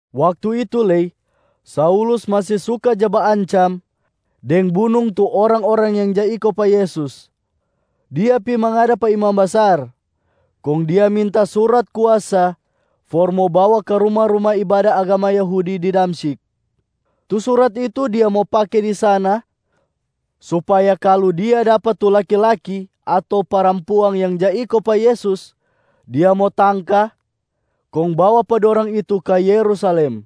Waktu itu lei, Saulus masi suka ja baancam deng bunung tu orang-orang yang ja iko pa Yesus. Dia pi mangada pa imam basar, kong dia minta surat kuasa for mo bawa ka ruma-ruma ibada agama Yahudi di Damsyik. Tu surat itu dia mo pake di sana supaya kalu dia dapa tu laki-laki ato parampuang yang ja iko pa Yesus, dia mo tangka kong bawa pa dorang itu ka Yerusalem.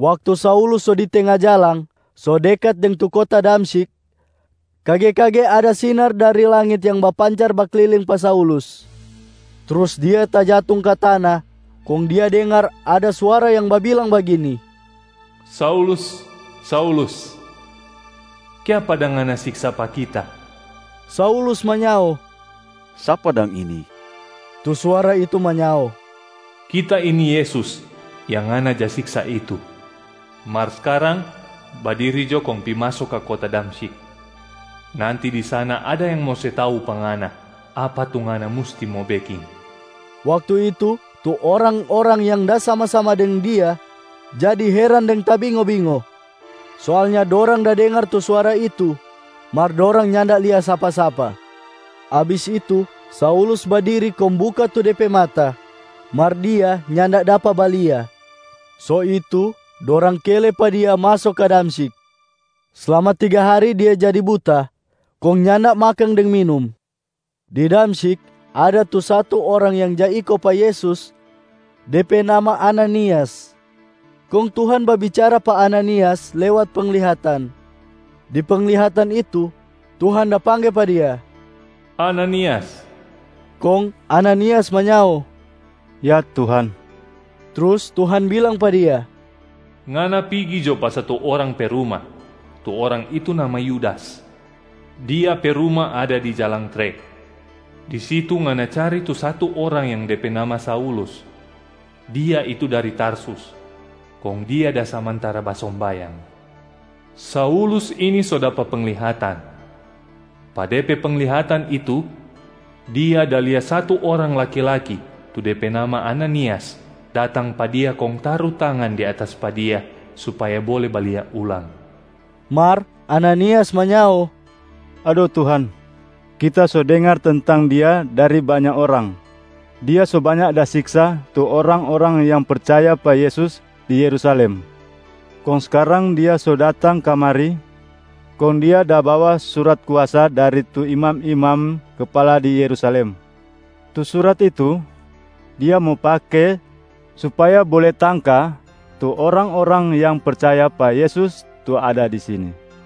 Waktu Saulus so di tenga jalang so dekat deng tu kota Damsyik, kage-kage ada sinar dari langit yang bapancar bakliling pa Saulus. Trus dia tajatung ka tana kong dia dengar ada suara yang babilang bagini, “Saulus, Saulus, kiapa dang ngana siksa pa Kita?” Saulus manyao, “Sapa dang ini?” Tu suara itu manyao, “Kita ini Yesus yang ngana ja siksa itu. Mar skarang badiri jo kong pi maso ka kota Damsyik. Nanti di sana ada yang mo se tau pa ngana apa tu ngana musti mo beking.” Waktu itu, tu orang-orang yang da sama-sama deng dia jadi heran deng tabingo-bingo. Soalnya dorang da dengar tu suara itu, mar dorang nyanda lia sapa-sapa. Abis itu, Saulus badiri kong buka tu de pe mata, mar dia nyanda dapa balia. So itu dorang kele pa dia maso ka Damsyik. Slama tiga hari dia jadi buta kong nyanda makang deng minum. Di Damsyik ada tu satu orang yang ja iko pa Yesus, de pe nama Ananias. Kong Tuhan babicara pa Ananias lewat penglihatan. Di penglihatan itu, Tuhan da pangge pa dia, “Ananias!” Kong Ananias manyao, “Ya, Tuhan!” Trus Tuhan bilang pa dia, “Ngana pigi jo pa satu orang pe ruma, tu orang itu nama Yudas. Dia pe ruma ada di Jalang Tre. Di situ ngana cari tu satu orang yang de pe nama Saulus. Dia itu dari Tarsus, kong dia da samantara basombayang. Saulus ini so dapa penglihatan. Pa de pe penglihatan itu, dia da lia satu orang laki-laki tu de pe nama Ananias datang pa dia kong taru tangan di atas pa dia supaya bole balia ulang.” Mar Ananias manyao, “Ado Tuhan, kita so dengar tentang dia dari banya orang. Dia so banya da siksa tu orang-orang yang percaya pa Yesus di Yerusalem. Kong skarang dia so datang kamari, kong dia da bawa surat kuasa dari tu imam-imam kapala di Yerusalem. Tu surat itu dia mo pake supaya bole tangka tu orang-orang yang percaya pa Yesus tu ada di sini.”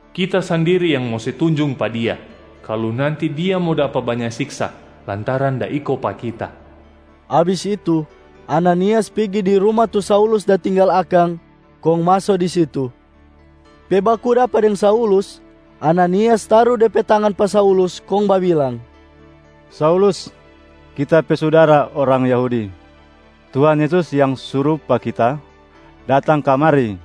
Kita sandiri yang mo se tunjung pa dia kalu nanti dia mo dapa banya siksa lantaran da iko pa Kita.” Abis itu, Ananias pigi di ruma tu Saulus da tinggal akang kong maso di situ. Pe baku dapa deng Saulus, Ananias taru de pe tangan pa Saulus kong babilang, “Saulus, kita pe sudara orang Yahudi. Tuhan Yesus yang suru pa kita datang kamari.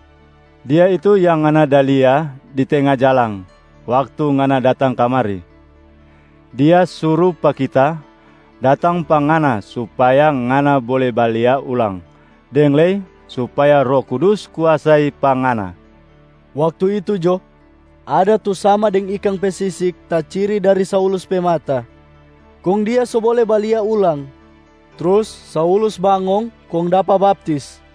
Dia itu yang ngana da lia di tenga jalang waktu ngana datang kamari. Dia suru pa kita datang pa ngana supaya ngana bole balia ulang deng lei supaya Roh Kudus kuasai pa ngana.” Waktu itu jo, ada tu sama deng ikang pe sisik taciri dari Saulus pe mata, kong dia so bole balia ulang. Trus Saulus bangong kong dapa baptis.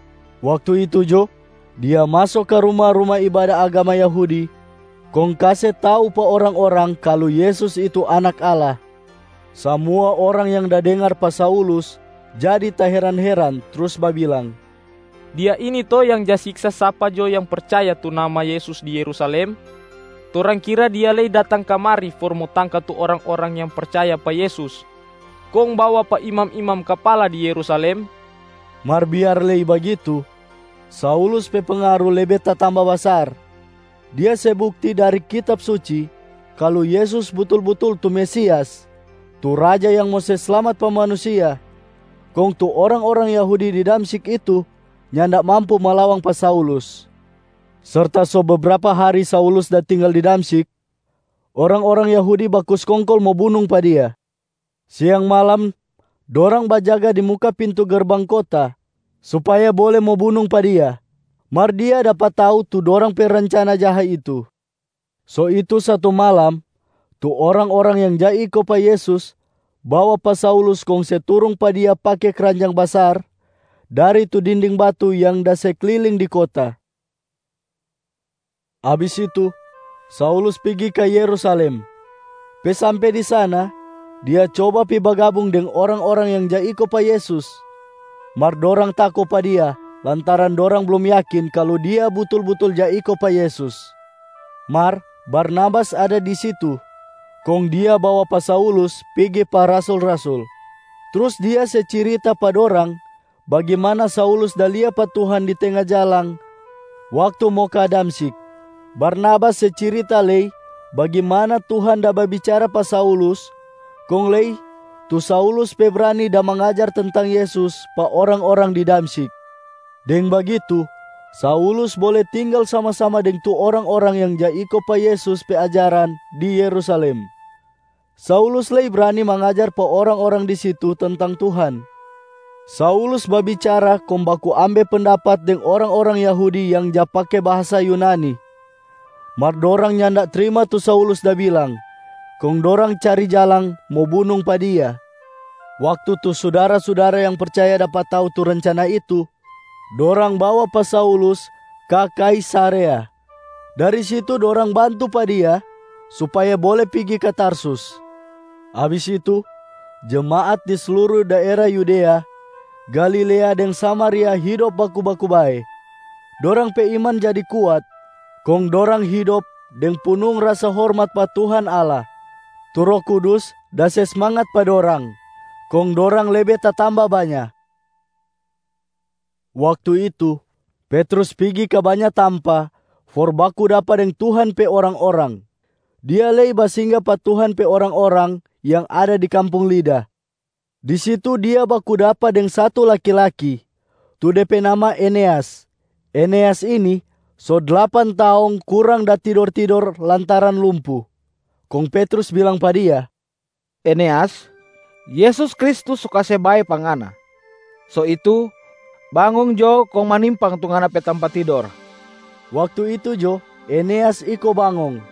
Waktu itu jo, dia maso ka ruma-ruma ibada agama Yahudi kong kase tau pa orang-orang kalu Yesus itu Anak Allah. Samua orang yang da dengar pa Saulus jadi taheran-heran trus babilang, “Dia ini to yang ja siksa sapa jo yang percaya tu nama Yesus di Yerusalem? Torang kira dia lei datang kamari for mo tangka tu orang-orang yang percaya pa Yesus kong bawa pa imam-imam kapala di Yerusalem?” Mar biar lei bagitu, Saulus pe pengaru lebe tatamba basar. Dia se bukti dari Kitab Suci kalu Yesus butul-butul tu Mesias tu Raja yang mo se slamat pa manusia, kong tu orang-orang Yahudi di Damsyik itu nyanda mampu malawang pa Saulus. Serta so bebrapa hari Saulus da tinggal di Damsyik, orang-orang Yahudi baku skongkol mo bunung pa dia. Siang malam dorang bajaga di muka pintu gerbang kota supaya bole mo bunung pa dia. Mar dia dapa tau tu dorang pe rencana jaha itu. So itu satu malam, tu orang-orang yang ja iko pa Yesus bawa pa Saulus kong se turung pa dia pake kranjang basar dari tu dinding batu yang da se kliling di kota. Abis itu, Saulus pigi ka Yerusalem. Pe sampe di sana, dia coba pi bagabung deng orang-orang yang ja iko pa Yesus. Mar dorang tako pa dia lantaran dorang blum yakin kalu dia butul-butul ja iko pa Yesus. Mar Barnabas ada di situ, kong dia bawa pa Saulus pigi pa rasul-rasul. Trus dia se cirita pa dorang bagimana Saulus da lia pa Tuhan di tenga jalang waktu mo ka Damsyik. Barnabas se cirita lei bagimana Tuhan da babicara pa Saulus kong lei tu Saulus pe brani da mangajar tentang Yesus pa orang-orang di Damsyik. Deng bagitu, Saulus bole tinggal sama-sama deng tu orang-orang yang ja iko pa Yesus pe ajaran di Yerusalem. Saulus lei brani mangajar pa orang-orang di situ tentang Tuhan. Saulus babicara kong baku ambe pendapat deng orang-orang Yahudi yang ja pake bahasa Yunani. Mar dorang nyanda trima tu Saulus da bilang, kong dorang cari jalang mo bunung pa dia. Waktu tu sudara-sudara yang percaya dapa tau tu rencana itu, dorang bawa pa Saulus ka Kaisarea. Dari situ dorang bantu pa dia supaya bole pigi ka Tarsus. Abis itu, jemaat di sluru daera Yudea, Galilea deng Samaria hidop baku-baku bae. Dorang pe iman jadi kuat kong dorang hidop deng punung rasa hormat pa Tuhan Allah. Tu Roh Kudus da se smangat pa dorang, kong dorang lebe tatamba banya. Waktu itu, Petrus pigi ka banya tampa for baku dapa deng Tuhan pe orang-orang, dia lei basingga pa Tuhan pe orang-orang yang ada di kampung Lida. Di situ dia baku dapa deng satu laki-laki, tu de pe nama Eneas. Eneas ini so dlapan taong kurang da tidor-tidor lantaran lumpu. Kong Petrus bilang pa dia, “Eneas, Yesus Kristus so kase bae pa ngana. So itu, bangong jo kong manimpang tu ngana pe tampa tidor!” Waktu itu jo, Eneas iko bangong.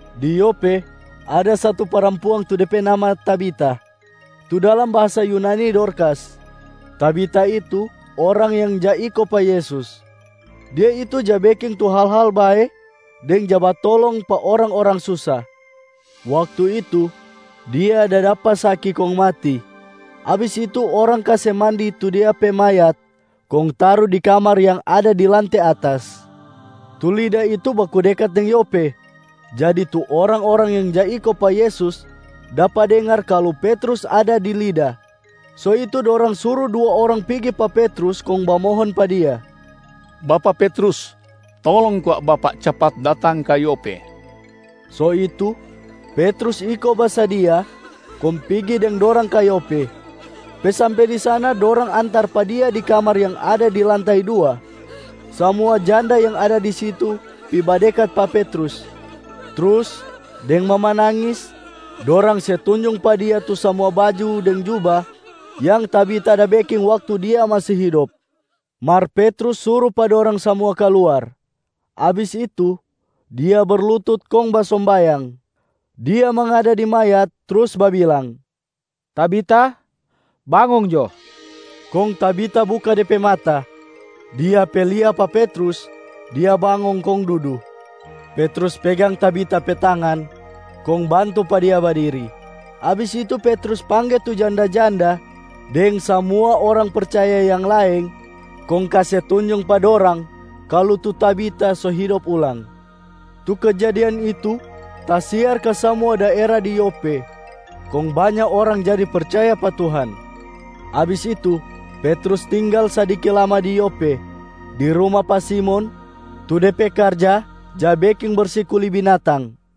Di Yope, ada satu parampuang tu dia pe nama Tabita, tu dalam bahasa Yunani Dorkasa. Tabita itu orang yang ja iko pa Yesus. Dia itu ja beking tu hal-hal bae deng ja batolong pa orang-orang susa. Waktu itu, dia da dapa saki kong mati. Abis itu orang kase mandi tu dia pe mayat kong taru di kamar yang ada di lante atas. Tu Lida itu baku dekat deng Yope. Jadi tu orang-orang yang ja iko pa Yesus dapa dengar kalu Petrus ada di Lida. So itu dorang suru dua orang pigi pa Petrus kong bamohon pa dia, “Bapak Petrus, tolong kwa bapak capat datang ka Yope.” So itu, Petrus iko basadia kong pigi deng dorang ka Yope. Pe sampe di sana, dorang antar pa dia di kamar yang ada di lantai dua. Samua janda yang ada di situ pi badekat pa Petrus. Trus deng mamanangis dorang se tunjung pa dia tu samua baju deng juba yang Tabita da beking waktu dia masi hidop. Mar Petrus suru pa dorang samua kaluar. Abis itu, dia berlutut kong basombayang. Dia mangada di mayat trus babilang, “Tabita, bangong jo!” Kong Tabita buka de pe mata. Dia pe lia pa Petrus, dia bangong kong dudu. Petrus pegang Tabita pe tangan kong bantu pa dia badiri. Abis itu Petrus pangge tu janda-janda deng samua orang percaya yang laeng, kong kase tunjung pa dorang kalu tu Tabita so hidop ulang. Tu kejadian itu tasiar ka samua daera di Yope kong banya orang jadi percaya pa Tuhan. Abis itu Petrus tinggal sadiki lama di Yope di ruma pa Simon tu de pe karja ja beking bersi kuli binatang.